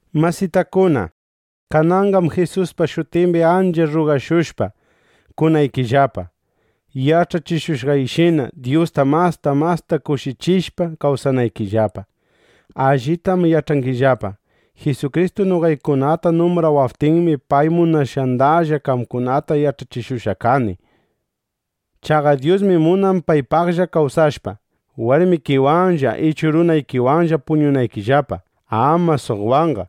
Masitakuna, kananqam Jisuspa shutimbi ancha rrugashushpa, kunaykillapa, yach'achishushqayshina, Dyusta masta masta kushichishpa kawsanaykillapa. Allitam yach'angillapa: Jisukristu noqaykunata numbrawaptinmi, pay munashqandalla qamkunata yach'achishushqa kani. Chaqa Dyusmi munan paypaqlla kawsashpa, warmikiwanlla ichu runaykiwanlla puñunaykillapa; ama suqwanqa.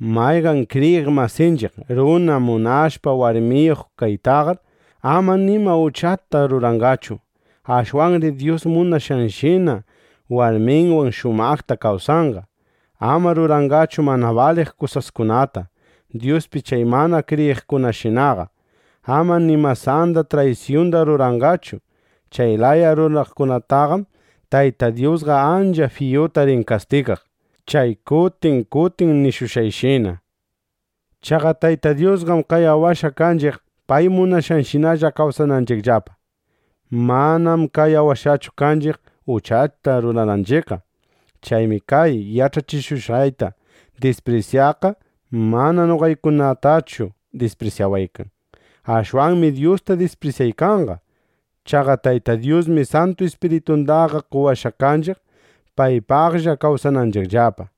Mayqan kriyiq masinchiq runa munashpa warmiyuq kaytaqar, ama nima uchata ruranqachu. Ashwanri Dyus munashqanshinalla warminwan shumaqta kawsanqa. Ama ruranqachu mana baliq kusaskunata, Dyuspi chay mana kriyiqkunashinaqa. Ama ni masanda traysyunda ruranqachu. Chay laya ruraqkunataqam Tayta Dyusqa ancha fiyuta rin kastigaq, chay kutin kutin nishushqayshina. Chaqa Tayta Dyusqam qayawashqa kanchiq, pay munashqanshinalla kawsananchiqllapa. Manam qayawashqachu kanchiq, uchata rurananchiqqa. Chaymi kay yach'achishushqayta disprisyaqqa mana noqaykunatallachu disprisyawaykan. Ashwanmi Dyusta disprisyaykanqa. Chaqa Tayta Dyusmi Santu Ispiritundaqa qowashqa kanchiq, paypaqlla kawsananchiqllapa.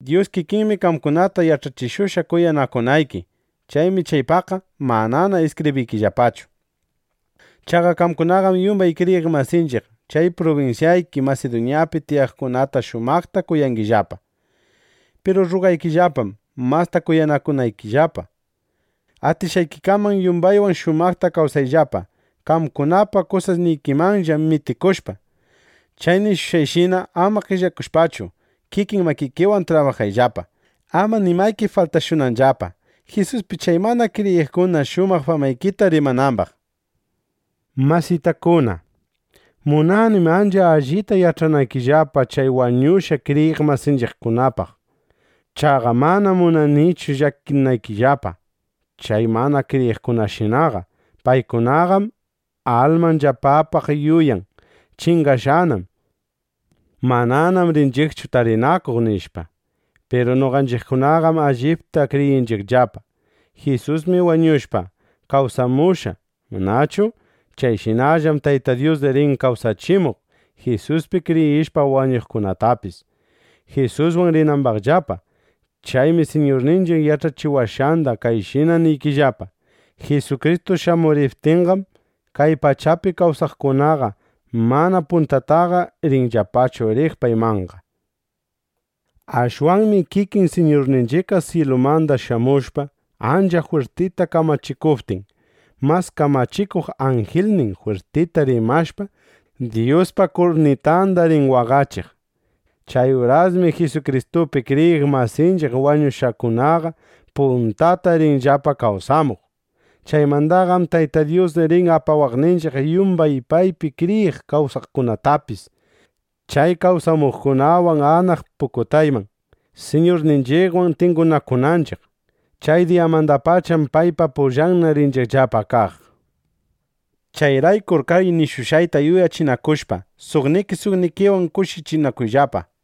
Dyus kikinmi qamkunata yach'achishushqa kuyanakunayki. Chaymi chaypaqqa manana iskibriykillapachu. Chaqa qamkunaqam yumbay kriyiq masinchiq chay prubinsyayki Masiduñapi tiyaqkunata shumaqta kuyangillapa. Piru rrugaykillapam, masta kuyanakunaykillapa. Atishqaykikaman yumbaywan shumaqta kawsayllapa, qamkunapa kusasnikimanlla mitikushpa. Chay nishushqayshina, ama qellakushpachu, kikin makikiwan trabajayllapa, ama nimayki faltashunanllapa, Jisuspi chay mana kriyiqkuna shumaq famaykita rimanambaq. Masitakuna, munanim ancha allita yach'anaykillapa chay wañushqa kriyiq masinchiqkunapaq. Chaqa manam munanichu llakinaykillapa chay mana kriyiqkunashinaqa. Paykunaqam almanllapapaq yuyan: Chingashqanam. Mananam rinchiqchu tarinakuq, nishpa. Piru noqanchiqkunaqam allipta kriyinchiqllapa: Jisusmi wañushpa, kawsamushqa, ¿manachu? Chayshinallam Tayta Dyus rin kawsachimuq Jisuspi kriyishpa wañuqkunatapis, Jisuswan rinambaqllapa. Chaymi Siñurninchiq yach'achiwashqanda kayshina niykillapa: Jisukristu shamuriptinqam, kay pachapi kawsaykaqkunaqa mana puntataqa rinllapachu riq paymanqa. Ashwanmi kikin Siñurninchiqqa syilumanda shamushpa, ancha jwirtita kamachikuptin, mas kamachikuq anjilnin jwirtita rimashpa, Dyuspa kurnitanda rin waqachiq. Chay urasmi Jisukristupi kriyiq masinchiq wañushqakunaqa puntata rinllapa kawsamuq. Chaymandaqam Tayta Dyus rin apawaqninchiq yumbay paypi kriyiq kawsaqkunatapis chay kawsamuqkunawan anaq pukutayman, Siñurninchiqwan tingunakunanchiq. Chay diyamandapacham paypa pullanna rinchiqllapa kaq. Chayraykur kay nishushqayta yuyachinakushpa, suqniki suqnikiwan kushichinakuyllapa.